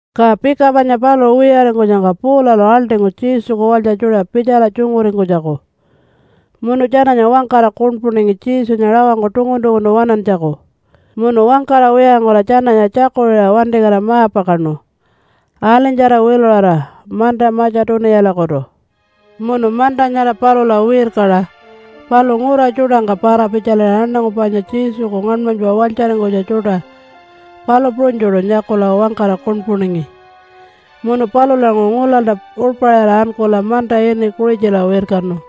Ka pika panya paluṟu wiyaringkunyangka Paulalu aḻṯingu Jesuku walytja tjuṯa pitjala tjunguringkunytjaku. Munu tjananya wangkara kuṉpuningi Jesunya rawangku tungun-tunguntu waṉantjaku munu wangkara wiyaringkula tjananya tjakuṟiṟa wantikatira ma-pakaṉu alinytjara wiluṟara manta Matja-tuniyalakutu. Munu manta nyara palula wirkaṟa, paluṟu ngura tjuṯangka para-pitjaliṟa aṉangu panya Jesuku ngaṉmanypa walytjaringkunytja tjuṯa, palu puṟunytjuṯu nyakula wangkara kuṉpuningi. Munu palulanguṟu ngulalta uḻpaṟira ankula manta ini Kuṟitjala wirkanu.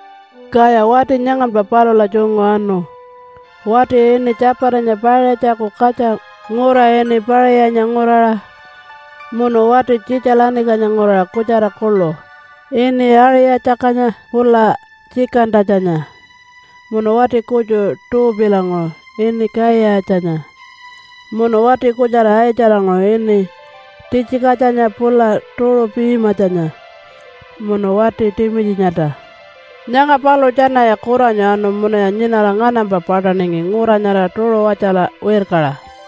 Kaya wati nyanganpa palula tjungu anu, wati ini Tjapatanya Paiṟatjaku katja ngura ini Paṟiyanya nguraṟa, munu wati Tjitja-lanikanya nguraṟa kutjara kuḻu ini Aṟi-tjakatjanya pula Tjikan-tatjanya munu wati kutju Tuupilanguṟu ini Kaiyatjanya munu wati kutjara Aitjalanguṟu ini Titjikatjanya pula Tuṟu-pimatjanya munu wati Timitjinyalta. Nyanga paluṟu tjanaya kuranyu anu munuya nyinara nganampa paṯaningi ngura nyara Tuṟuwatjala wirkaṟa.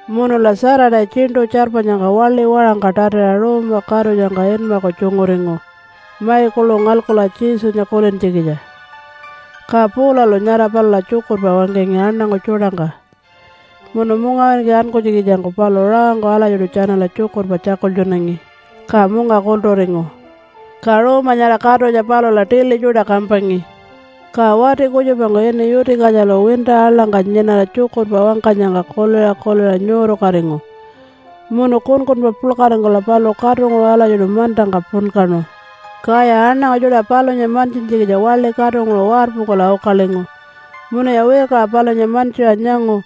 Munula Saturday tjiṉṯu tjarpanyangka waḻi waṟangka tatiṟa ruuma katutjangka inmaku tjunguringu mai kuḻu ngalkula Jesunya kulintjikitja. Ka Paulalu nyara palula tjukurpa wangkangi aṉangu tjuṯangka munu mungawinki ankunytjikitjangku paluṟu rawangku alatjiṯu tjanala tjukurpa tjakultjunangi, ka munga kulturingu. Ka ruuma nyara katutja palula tili tjuṯa kampangi. Ka wati kutjupangku ini Yuti-katjalu winta aḻangka nyinara tjukurpa wangkanyangka kuliṟa kuliṟa nyuurukatingu munu kunkunpa puḻkaringkula paluṟu katunguṟu alatjiṯu mantangka punkaṉu. Kaya aṉangu tjuṯa palunya mantjintjikitja waḻi katunguṟu warpungkula ukalingu, munuya wirkaṟa palunya mantjiṟa nyangu,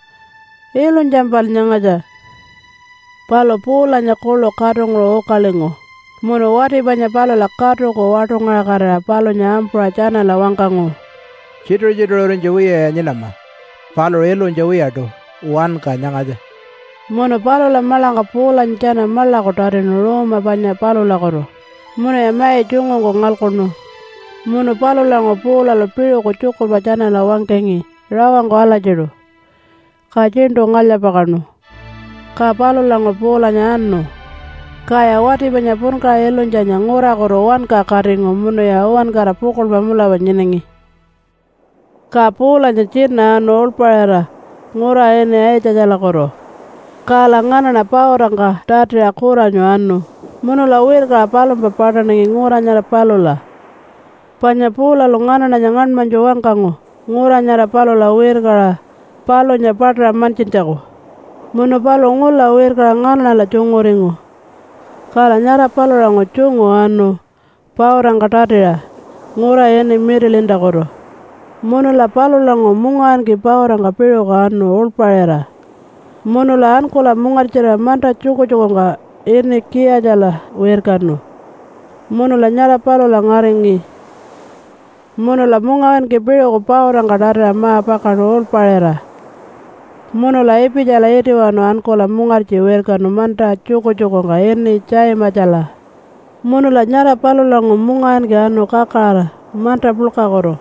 “Ilunytjampal nyangatja!” Palu Paulanya kuḻu katunguṟu ukalingu munu wati panya palula katuku waṯungaṟakatira palunya ampuṟa tjanala wangkangu, “Tjituṟu-tjituṟurinytja wiyaya nyinama! Paluṟu ilunytja wiyaṯu. Wanka nyangatja.” Munu palula maḻangka Paulanya tjana maḻaku tatinu ruuma panya palulakutu, munuya mai tjungungku ngalkuṉu. Munu palulanguṟu Paulalu piṟuku tjukurpa tjanala wangkangi rawangku alatjiṯu, ka tjiṉṯu ngalya-pakaṉu. Ka palulanguṟu Paulanya anu. Kaya wati panya punkaṟa ilunytjanya ngurakutu wanka katingu munuya uwankara pukuḻpa mulapa nyinangi. Ka Paulanya tjina anu uḻpaṟira ngura ini Aitjatjalakutu. Kala nganaṉa pautangka tatiṟa kuranyu anu munula wirkaṟa palumpa paṯaningi ngura nyara palula. Panya Paulalu nganaṉanya ngaṉmanytju wangkangu ngura nyara palula wirkaṟa palunya paṯaṟa mantjintjaku. Munu paluṟu ngula wirkaṟa nganaṉala tjunguringu. Kala nyara palulanguṟu tjungu anu pautangka tatiṟa ngura ini Mitilintakutu. Munula palulanguṟu mungawinki pautangka piṟuku anu uḻpaṟira, munula ankula mungartjirira manta tjukutjukungka ini Kiyatjala wirkanu munula nyara palula ngaringi. Munula mungawinki piṟuku pautangka tatiṟa ma-pakaṉu uḻpaṟira munula Ipitjala itiwanu ankula mungartji wirkanu manta tjukutjukungka ini Tjaimatjala. Munula nyara palulanguṟu mungawinki anu kakaraṟa manta puḻkakutu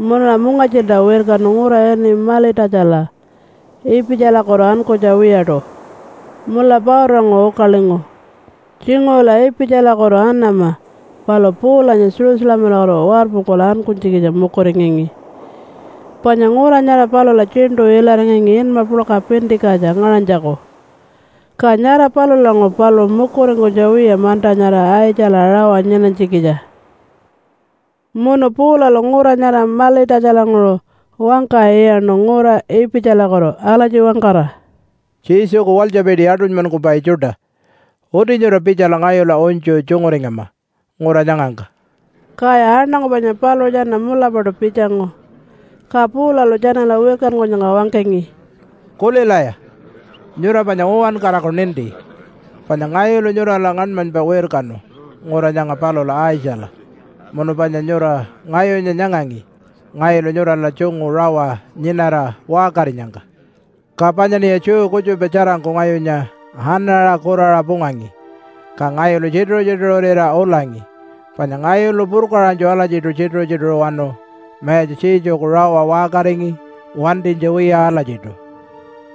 munula mungartjilta wirkanu ngura ini Malitatjala Ipitjalakutu ankunytja wiyaṯu, munula pautanguṟu ukalingu. Tjinguṟula Ipitjalakutu anama palu Paulanya Jerusalemalakutu warpungkula ankunytjikitja mukuringangi, panya ngura nyara palula tjiṉṯu ilaringangi inma puḻka Pintikatja ngaṟanytjaku. Ka nyara palulanguṟu paluṟu mukuringkunytja wiya manta nyara Aitjala rawa nyinanytjikitja. Munu Paulalu ngura nyara Malitatjalanguṟu wangka iyaṉu ngura Ipitjalakutu alatji wangkara, “Jesuku walytjapiti aṯunymankupai tjuṯa! Uti nyura pitjala ngayula unytju tjunguringama ngura nyangangka.” Kaya aṉangu panya paluṟu tjana mulapaṯu pitjangu. Ka Paulalu tjanala wirkankunyangka wangkangi, “Kulilaya! Nyura panya uwankaraku ninti, panya ngayulu nyurala ngaṉmanypa wirkanu ngura nyanga palula Aitjala, munu panya nyura ngayunya nyangangi ngayulu nyurala tjungu rawa nyinara waṟkarinyangka. Ka panyaṉiya Jew kutjupa tjarangku ngayunya anaṟa kuraṟa pungangi, ka ngayulu tjituṟu-tjituṟurira ulangi. Panya ngayulu purkaṟanytju alatjiṯu tjituṟu-tjituṟuwanu Mayatja Jesuku rawa waṟkaringi wantinytja wiya alatjiṯu.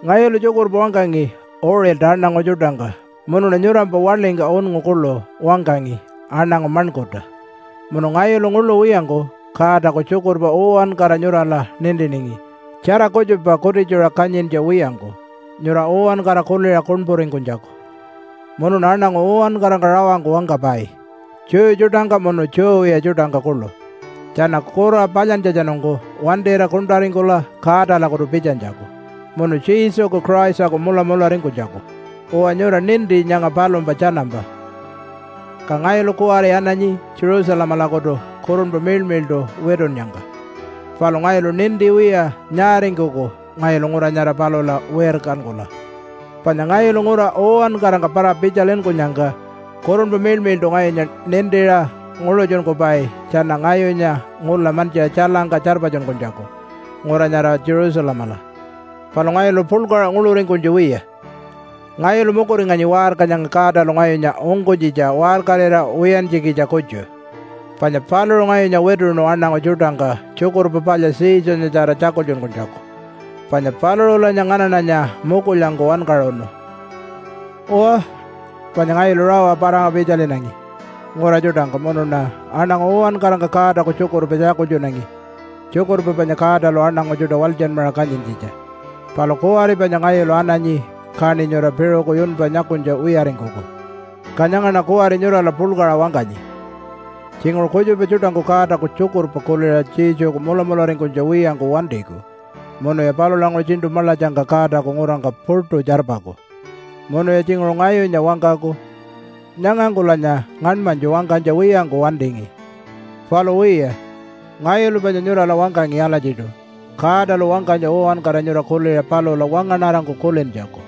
Ngayulu tjukurpa wangkangi uṟilta aṉangu tjuṯangka munuṉa nyurampa waḻingka unngu kuḻu wangkangi aṉangu maṉkurta. Munu ngayulu nguḻu wiyangku Godaku tjukurpa uwankara nyurala nintiningi tjara kutjupa kutitjuṟa kanyintja wiyangku nyura uwankara kuliṟa kuṉpuringkunytjaku. Munuṉa aṉangu uwankarangka rawangku wangkapai Jew tjuṯangka munu Jew wiya tjuṯangka kuḻu tjana kura palyantjatjanungku wantira kuṉṯaringkula Godalakutu pitjanytjaku munu Jesuku Christaku mulamularingkunytjaku. Uwa, nyura ninti nyanga palumpa tjanampa. “Ka ngayulu kuwari ananyi Jerusalemalakutu Kurunpa Miḻmiḻṯu witunnyangka, palu ngayulu ninti wiya nyaaringkuku ngayulu ngura nyara palula wirkankula. Panya ngayulu ngura uwankarangka para-pitjalinkunyangka Kurunpa Miḻmiḻṯu ngayunya nintiṟa nguḻutjunkupai tjana ngayunya ngula mantjiṟa tjailangka tjarpatjunkunytjaku ngura nyara Jerusalemala. Palu ngayulu puḻkaṟa nguḻuringkunytja wiya. Ngayulu mukuringanyi waṟka nyanga Godalu ngayunya ungkunytjitja waṟkarira wiyantjikitja kutju. Panya paluṟu ngayunya wituṉu aṉangu tjuṯangka Tjukurpa Palya Jesunyatjara tjakultjunkunytjaku, panya paluṟulanya nganaṉanya mukulyangku wankaṟunu. “Uwa, panya ngayulu rawa para-pitjalinangi ngura tjuṯangka munuṉa aṉangu uwankarangka Godaku tjukurpa tjakultjunangi, tjukurpa panya Godalu aṉangu tjuṯa walytjanmaṟa kanyintjitja. Palu kuwari panya ngayulu ananyi, kaṉi nyura piṟuku yunpa nyakunytja wiyaringkuku. Ka nyangaṉa kuwari nyurala puḻkaṟa wangkanyi. Tjinguṟu kutjupa tjuṯangku Godaku tjukurpa kuliṟa Jesuku mulamularingkunytja wiyangku wantiku munuya palulanguṟu tjiṉṯu maḻatjangka Godaku ngurangka puṯu tjarpaku. Munuya tjinguṟu ngayunya wangkaku, ‘Nyangangkulanya ngaṉmanytju wangkanytja wiyangku wantingi.’ Palu wiya, ngayulu panya nyurala wangkangi alatjiṯu Godalu wangkanytja uwankara nyura kuliṟa palula wangaṉarangku kulintjaku.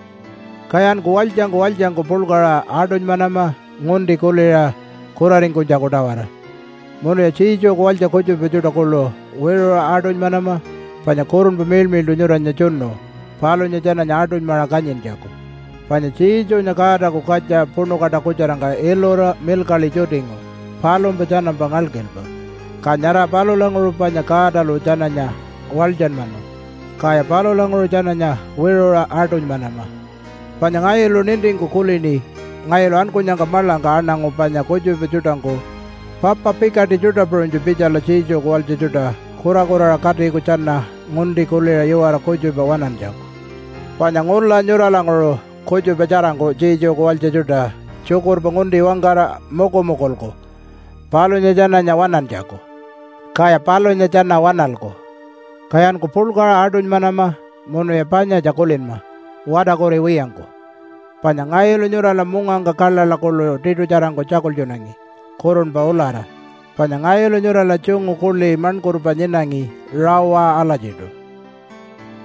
Kayanku walytjangku walytjangku puḻkaṟa aṯunymanama ngunti kuliṟa kuraringkunytjaku-tawara munuya Jesuku walytja kutjupa tjuṯa kuḻu wiṟuṟa aṯunymanama, panya Kurunpa Miḻmiḻṯu nyuranya tjunu palunya tjananya aṯunymaṟa kanyintjaku. Panya Jesunya Godaku katja puṉu kaṯakutjarangka ilura milkaḻi tjutingu palumpa tjanampa ngalkilpa, ka nyara palulanguṟu panya Godalu tjananya walytjanmanu. Kaya palulanguṟu tjananya wiṟuṟa aṯunymanama. Panya ngayulu nintingku kulini ngayulu ankunyangka maḻangka aṉangu panya kutjupa tjuṯangku papa pikaṯi tjuṯa puṟunytju pitjala Jesuku walytja tjuṯa kurakuraṟa katiku tjana ngunti kuliṟa iwara kutjupa waṉantjaku. Panya ngula nyuralanguṟu kutjupa tjarangku Jesuku walytja tjuṯa tjukurpa ngunti wangkara mukumukulku palunya tjananya waṉantjaku, kaya palunya tjana waṉalku. Kayanku puḻkaṟa aṯunymanama munuya panyatja kulinma watarkuriwiyangku, panya ngayulu nyurala mungangka kaḻaḻa kuḻu tiṯutjarangku tjakultjunangi kurunpa ulara, panya ngayulu nyurala tjungu kuḻi maṉkurpa nyinangi rawa alatjiṯu.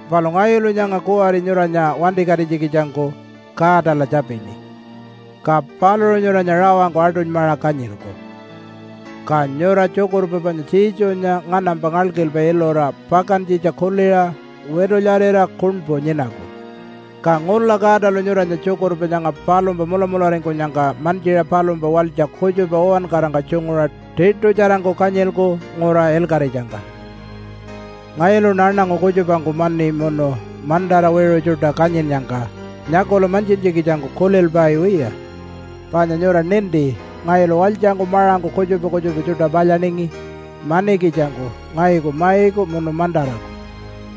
“Palu ngayulu nyanga kuwari nyuranya wantikatinytjikitjangku Godala tjapini, ka paluṟu nyuranya rawangku aṯunymaṟa kanyilku. Ka nyura tjukurpa panya Jesunya nganampa ngalkilpa ilura pakantjitja kuliṟa witulyarira kuṉpu nyinaku. Ka ngula Godalu nyuranya tjukurpa nyanga palumpa mulamularingkunyangka mantjiṟa palumpa walytja kutjupa uwankarangka tjunguṟa tiṯutjarangku kanyilku ngura ilkaṟitjangka. “Ngayuluṉa aṉangu kutjupangku mani munu mantara wiṟu tjuṯa kanyinnyangka nyakula mantjintjikitjangku kulilpai wiya. Panya nyura ninti, ngayulu walytjangku maṟangku kutjupa kutjupa tjuṯa palyaningi manikitjangku ngayuku maiku munu mantaraku.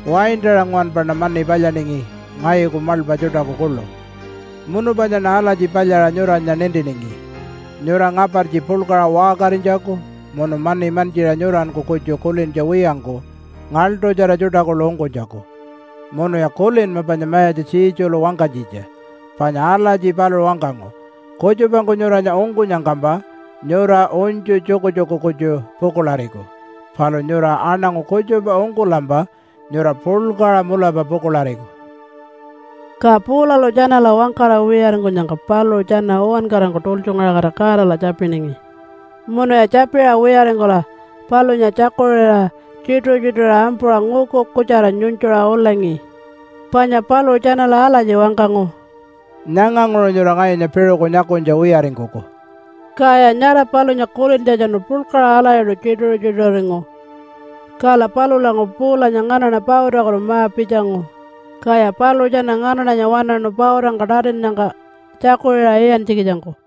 Waintaṟa nguwanpaṉa mani palyaningi ngayuku maḻpa tjuṯaku kuḻu. Munu panyaṉa alatji palyaṟa nyuranya nintiningi nyura ngapartji puḻkaṟa waṟkarinytjaku munu mani mantjiṟa nyuranku kutju kulintja wiyangku ngaḻṯutjara tjuṯa kuḻu ungkunytjaku. Munuya kulinma panya Mayatja Jesulu wangkanytjitja, panya alatji paluṟu wangkangu, ‘Kutjupangku nyuranya ungkunyangkampa nyura unytju tjukutjuku kutju pukuḻariku, palu nyura aṉangu kutjupa ungkulampa nyura puḻkaṟa mulapa pukuḻariku.’” Ka Paulalu tjanala wangkara wiyaringkunyangka paluṟu tjana uwankarangku tultjungaṟakatira Godala tjapiningi. Munuya tjapiṟa wiyaringkula palunya tjakuṟiṟa tjituṟu-tjituṟurira ampuṟa nguku kutjara nyunytjuṟa ulangi. Panya paluṟu tjanala alatji wangkangu, “Nyanganguṟu nyura ngayunya piṟuku nyakunytja wiyaringkuku.” Kaya nyara palunya kulintjatjanu puḻkaṟa alatjiṯu tjituṟu-tjituṟuringu. Kala palulanguṟu Paulanya nganaṉa pautakutu ma-pitjangu. Kaya paluṟu tjana nganaṉanya waṉaṉu pautangka tatinnyangka tjakuṟiṟa iyantjikitjangku.